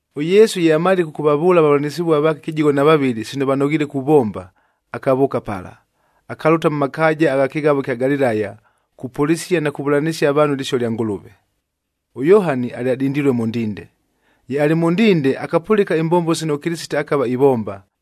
ɄYesu ye amalile kʉkʉvavʉʉla avavʉlanɨsɨvua vaake kɨjigho na vavɨlɨ sino vanoghiile kuvomba, akavʉʉka pala, akalʉta mʉ makaaja agha kɨghavo ɨkya Galilaya kupʉlɨsia na kuvʉlanɨsia avaanhu ɨlɨsio lya Ngʉlʉve. ɄYohani alyadindilue mʉ ndinde. Ye alɨ mʉ ndinde, akapʉlɨka imbombo sino ʉKɨlɨsite akava ivomba.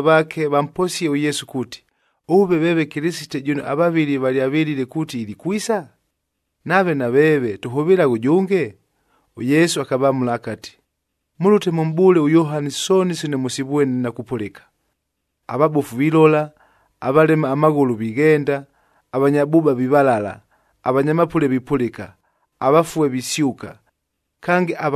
vamposie ʉYesu kuuti, “Ʉve veeve Kɨlɨsite jʉno avavɨli valyavɨlile kuuti ilikwisa? Nave naveeve tʉhʉvɨlaghe ʉjʉnge?” ɄYesu akavamʉla akati, “Mʉlʉte mʉmʼbʉʉle ʉYohani sooni sino mʉsivwene na kupʉlɨka. Avabofu vilola, avalema amaghʉlʉ vighenda, avanya bʉʉba vivalala, avanya mapʉle vipʉlɨka, avafue visyʉka. Kange,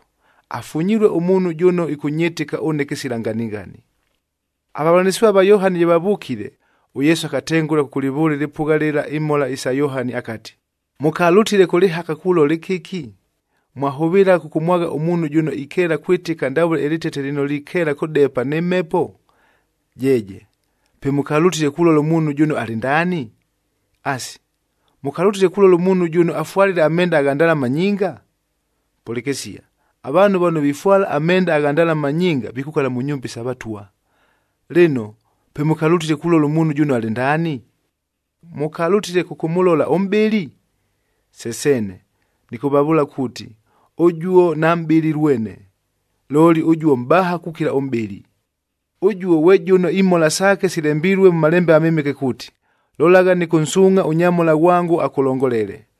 Afunyilue ʉmuunhu jʉno ɨkʉnyɨtɨka ʉne kɨsila nganighani.” Avavʉlanɨsɨvua va Yohani ye vavʉkile, ʉYesu akatengʉla kʉkʉlɨvʉʉla ɨlɨpʉgha lɨla imhola isa Yohani akati, “Mʉkalʉtile kʉ lɨhaka kulola ɨkɨki? Mwahʉvɨlagha kʉkʉmwagha ʉmuunhu jʉno ikeela kwɨtɨka ndavʉle ɨlɨtete lɨno likeela kʉdepa nɨ mhepo? Jeeje! Pe mʉkalʉtile kulola ʉmuunhu jʉno alɨ ndaani? Asi, mʉkalʉtile kulola ʉmuunhu jʉno afwalile amenda agha ndalama nyinga? Pʉlɨkɨsia, avaanhu vano vifwala amenda agha ndalama nyinga vikukala mʉ nyumba isa vatwa. Lɨno, pe mʉkalʉtile kulola ʉmuunhu jʉno alɨ ndaani? Mʉkalʉtile kʉkʉmʉlola ʉmʼbɨli? Se seene! Nɨkʉvavʉʉla kuuti, ʉjuo namʼbɨli lwene, looli ʉjuo mʼbaha kukila ʉmʼbɨli. Ʉjuo ghwe jʉno imhola saake silembilue mʉ Malembe aMɨmɨke kuuti, ‘Lolagha, nɨkʉnsuungʼha ʉnyamhola ghwango akʉlongolele.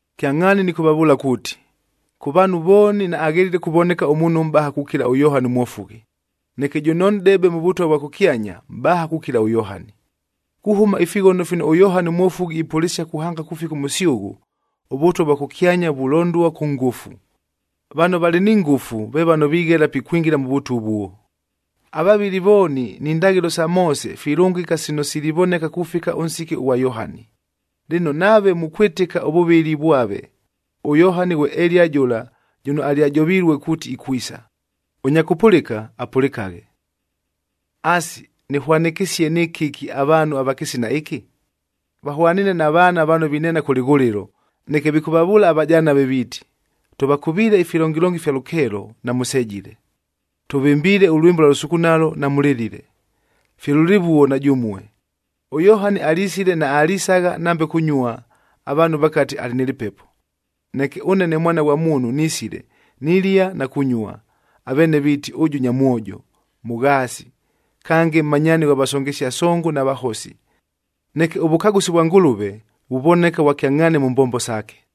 “Kyangʼhaani nɨkʉvavʉʉla kuuti, kʉ vaanhu vooni naaghelile kuvoneka ʉmuunhu ʉmʼbaha kukila ʉYohani ʉMwofughi. Neke jʉno nʼdebe mʉ Vʉtwa vwa kʉkyanya, mʼbaha kukila ʉYohani. Kuhʉma ifighono fino ʉYohani ʉMwofughi ipʉlɨsia kuhanga kufika ʉmʉsyʉghʉ, ʉVʉtwa vwa kʉkyanya vulondua kʉ ngʉfu. Vano valɨ ni ngʉfu, ve vano vighela pikwingila mʉ Vʉtwa ʉvuo. Avavɨli vooni ni ndaghɨlo sa Moose filʉngɨka sino silivoneka kufika ʉnsiki ʉghwa Yohani. Lɨno, nave mukwɨtɨka ʉvʉvɨli vwave, ʉYohani ghwe Eliya jʉla jʉno alyajovilue kuuti ikwisa. Ʉnya kʉpʉlɨka, apʉlɨkaghe. “Asi, nɨhwanɨkɨsie nɨ kɨki avaanhu ava kɨsina ɨkɨ? Vahwaniine na vaana vano vineena kʉ lɨghʉlɨlo, neke vikʉvavʉʉla avajanave viiti, ‘Tʉvakʉviile ifilongilongi ifya lʉkeelo, namʉsejile! Tʉvɨmbiile ʉlwɨmbo ʉlwa lʉsukunalo, namʉlɨlile!’ Fye lʉlɨvuo na jʉmue! ɄYohani alisile, naalisagha nambe kunyua, avaanhu vakati, ‘Alɨ nɨ lɨpepo.’ Neke ʉne ne Mwana ghwa Muunhu nisile, nilia na kunyua, aveene viiti, ‘Ʉjʉ nyamwojo, mʉghaasi! Kange, mmanyaani ghwa vasongesia songo, na vahosi!’ Neke ʉvʉkagʉsi vwa Ngʉlʉve, vuvoneka vwa kyangʼhaani mʉ mbombo saake.”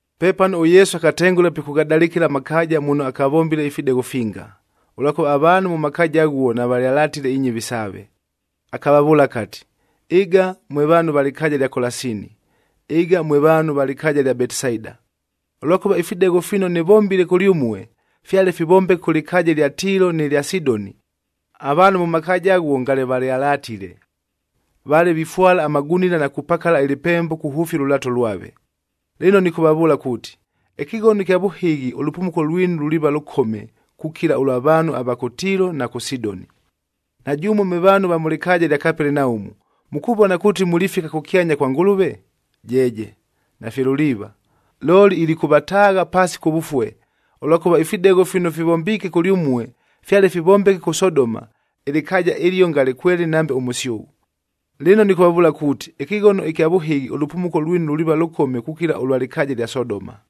Pepano ʉYesu akatengʉla pikʉghadalɨkɨla amakaaja muno akavombile ifidegho finga, ʉlwakʉva avaanhu mʉ makaaja aghuo navalyalatile inyɨvi saave. Akavavʉʉla akati, “Ɨga mwe vaanhu va lɨkaaja lya Kolasini! Ɨga mwe vaanhu va lɨkaaja ɨlya Betisaida! Ʉlwakʉva ifidegho fino nɨvombile kʉlyʉmue, fyale fivombeke kʉ lɨkaaja ɨlya Tiilo nɨ lya Sidoni,c avaanhu mʉ makaaja aghuo ngale valyalatile. Vale vifwala amagunila na kupakala ɨlɨpembo kuhʉfia ʉlʉlaato lwave. Lɨno nɨkʉvavʉʉla kuuti, ɨkɨghono ɨkya vʉhɨghi ʉlʉpumuko lwinu luliiva lʉkome, kukila ʉlwa vaanhu ava kʉ Tiilo na kʉ Sidoni. “Na jʉmue mwe vaanhu mʉ lɨkaaja lya Kapelenaumu, mukuvona kuuti mulifika kʉkyanya kwa Ngʉlʉve? Jeeje, nafye luliiva! Looli ilikʉvataagha paasi kʉvʉfue. Ʉlwakʉva ifidegho fino fivombiike kʉlyʉmue fyale fivombeke kʉ Sodoma,d ɨlɨkaaja ɨlio ngale kwelɨlɨ nambe ʉmʉsyʉghʉ. Lɨno nɨkʉvavʉʉla kuuti, ɨkɨghono ɨkya vʉhɨghi ʉlʉpumuko lwinu luliiva lʉkome kukila ʉlwa lɨkaaja ɨlya Sodoma.”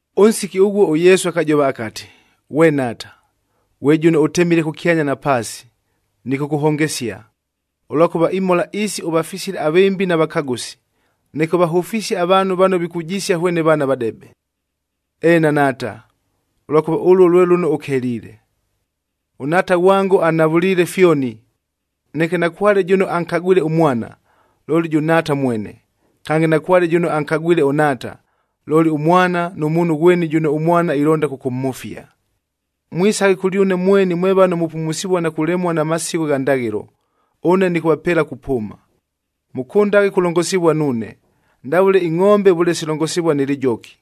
Ʉnsiki ʉghuo ʉYesu akajova akati, “Ghwe Nhaata, ghwe jʉno ʉtemile kʉkyanya na paasi nɨkʉkʉhongesia, ʉlwakʉva imhola isi ʉvafisile avɨmbi na vakagʉsi, neke ʉvahʉfisie avaanhu vano vikujisia hwene vaana vadebe. Eena Nhaata, ʉlwakʉva ʉluo lwe lʉno ʉkeliile. “ɄNhaata ghwango anhavʉliile fyoni. Neke nakwale jʉno ankagwile ʉMwana, looli jʉ Nhaata mwene. Kange, nakwale jʉno ankagwile ʉNhaata, looli ʉMwana, nʉ muunhu ghweni jʉno ʉMwana ilonda kʉkʉmhʉfia. “Mwisaghe kʉlyʉne mweni mwe vano mupumusivua na kulemua na masigho gha ndaghɨlo, ʉne nɨkʉvapeela kupʉʉma. Mʉkʉndaghe kulongosivua nuune, ndavʉle ingʼombe vʉle silongosivua nɨ lɨjoki.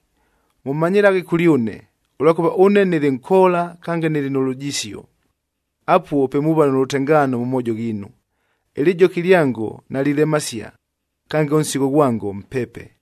Mʉmanyɨlaghe kʉlyʉne, ʉlwakʉva ʉne nɨlɨ nkoola kange nɨlɨ nʉ lujisio. Apuo pe muuva nʉ lʉtengaano mʉ moojo ghiinu. Ɨlɨjoki lyango nalilemasia, kange ʉnsigho ghwango mpepe.”